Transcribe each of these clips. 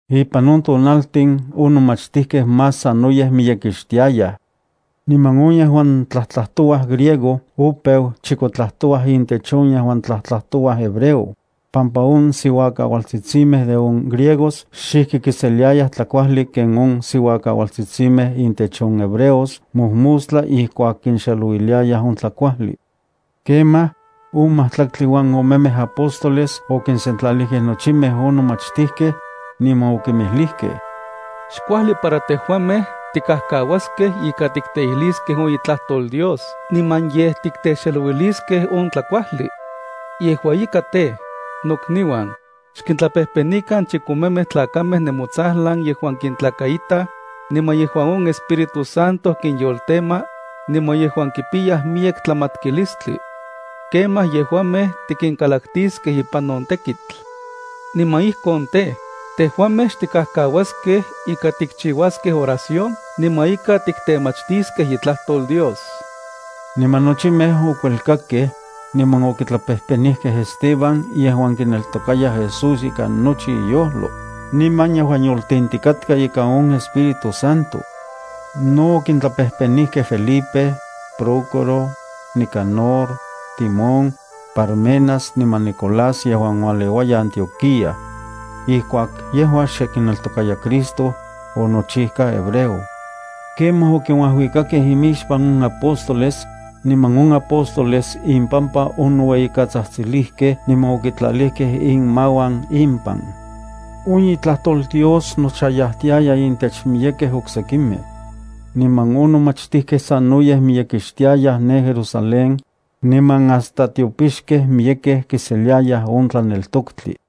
Ipan on tonaltin on nomachtijkej más sanoyej miyekixtiayaj. Niman on yejuan tlajtlajtouaj griego opeu chikotlatouaj intech on yejuan tlajtlajtouaj hebreo, pampa on siuakaualtsitsimej de on griegos xijki kiseliayaj tlakuajli ken on siuakaualtsitsimej intech on hebreos mojmostla ijkuak kinxelouiliayaj on tlakuajli. Kemaj, on majtlaktli uan omemej apóstoles okinsentlalijkej nochimej on nomachtijkej, niman okinmijlijkej: —Xkuajli para tejuamej tikajkauaskej ika tikteijliskej on itlajtol Dios niman yej titexelouiliskej on tlakuajli. Yejua ika tej, nokniuan, xkintlapejpenikan chikomemej tlakamej nemotsajlan yejuan kintlakaitaj, niman yejuan on Espíritu Santo kinyoltema, niman yejuan kipiyaj miyek tlamatkilistli. Kemaj yejuamej tikinkalaktiskej ipan on tekitl. Niman ijkon tej, tejuamej xtikajkauaskej ika tikchiuaskej oración niman ika tiktemachtiskej itlajtol Dios. Niman nochimej okuelkakej, niman okitlapejpenijkej Esteban yejuan kineltokaya Jesús ikan nochi iyojlo, niman yejuan yoltentikatka ika on Espíritu Santo. No okintlapejpenijkej Felipe, Prócoro, Nicanor, Timón, Parmenas niman Nicolás yejuan ualeuaya Antioquía. Ijkuak yejua xe kineltokaya Cristo, onochijka hebreo. Kemaj okinuajuikakej imixpan on apóstoles, niman on apóstoles impampa onoueyikatsajtsilijkej niman okitlalijkej inmauan impan. On itlajtol Dios nochayajtiaya intech miyekej oksekimej. Niman on nomachtijkej sanoyej miyekixtiayaj ne Jerusalén, niman hasta tiopixkej miyekej kiseliayaj on tlaneltoktli.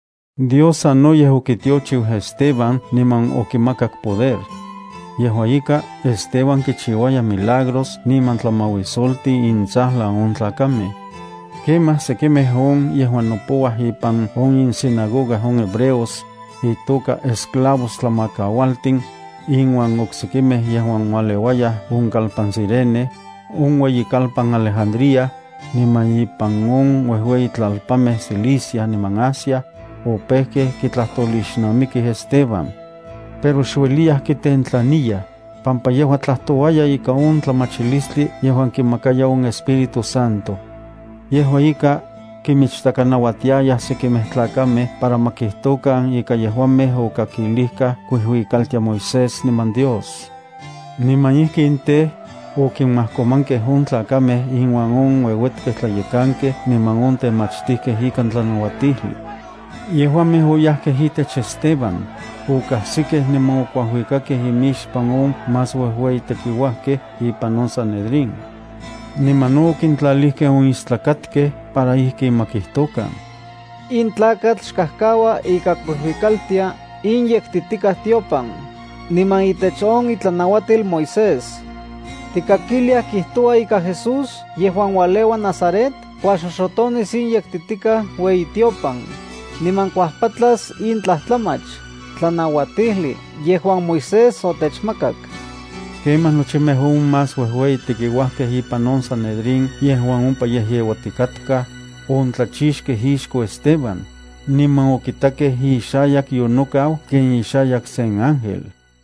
Dios sanoyej okitiochiu Esteban niman okimakak poder. Yejua ika, Esteban kichiuaya milagros niman tlamauisoltin intsajlan on tlakamej. Kemaj sekimej on yejuan nopouaj ipan on insinagoga on hebreos, itoka “Esclavos Tlamakaualtin”, inuan oksekimej yejuan ualeuayaj on kalpan Cirene, on ueyikalpan Alejandría, niman ipan on uejueyitlalpanmej Cilicia niman Asia, opejkej kitlajtolixnamikij Esteban. Pero xueliyaj kitentlaniyaj, pampa yejua tlajtouaya ika on tlamachilistli yejuan kimakaya on Espíritu Santo. Yejua ika, kimichtakanauatiayaj sekimej tlakamej para ma kijtokan ika yejuamej okakilijkaj kuijuikaltia Moisés niman Dios. Niman ijkin tej, okimajkomankej on tlakamej inuan on ueuetkej tlayekankej niman on temachtijkej ikan tlanauatijli. Yejuamej oyajkej itech Esteban, okajsikej niman okuajuikakej imixpan on más uejueyi tekiuajkej ipan on Sanedrín. Niman no okintlalijkej on istlakatkej para ijkin ma kijtokan: —In tlakatl xkajkaua ika kuijuikaltia in yektitikaj tiopan, niman itech on itlanauatil Moisés. Tikakiliaj kijtoua ika Jesús yejuan ualeua Nazaret kuajxoxotonis in yektitikaj ueyitiopan, niman kuajpatlas in tlajtlamach tlanauatijli yejuan Moisés otechmakak. Kemaj nochimej on más uejueyi tekiuajkej ipan on Sanedrín yejuan ompa yejyeuatikatkaj, ontlachixkej ixko Esteban, niman okitakej ixayak yonokau ken ixayak sen ángel.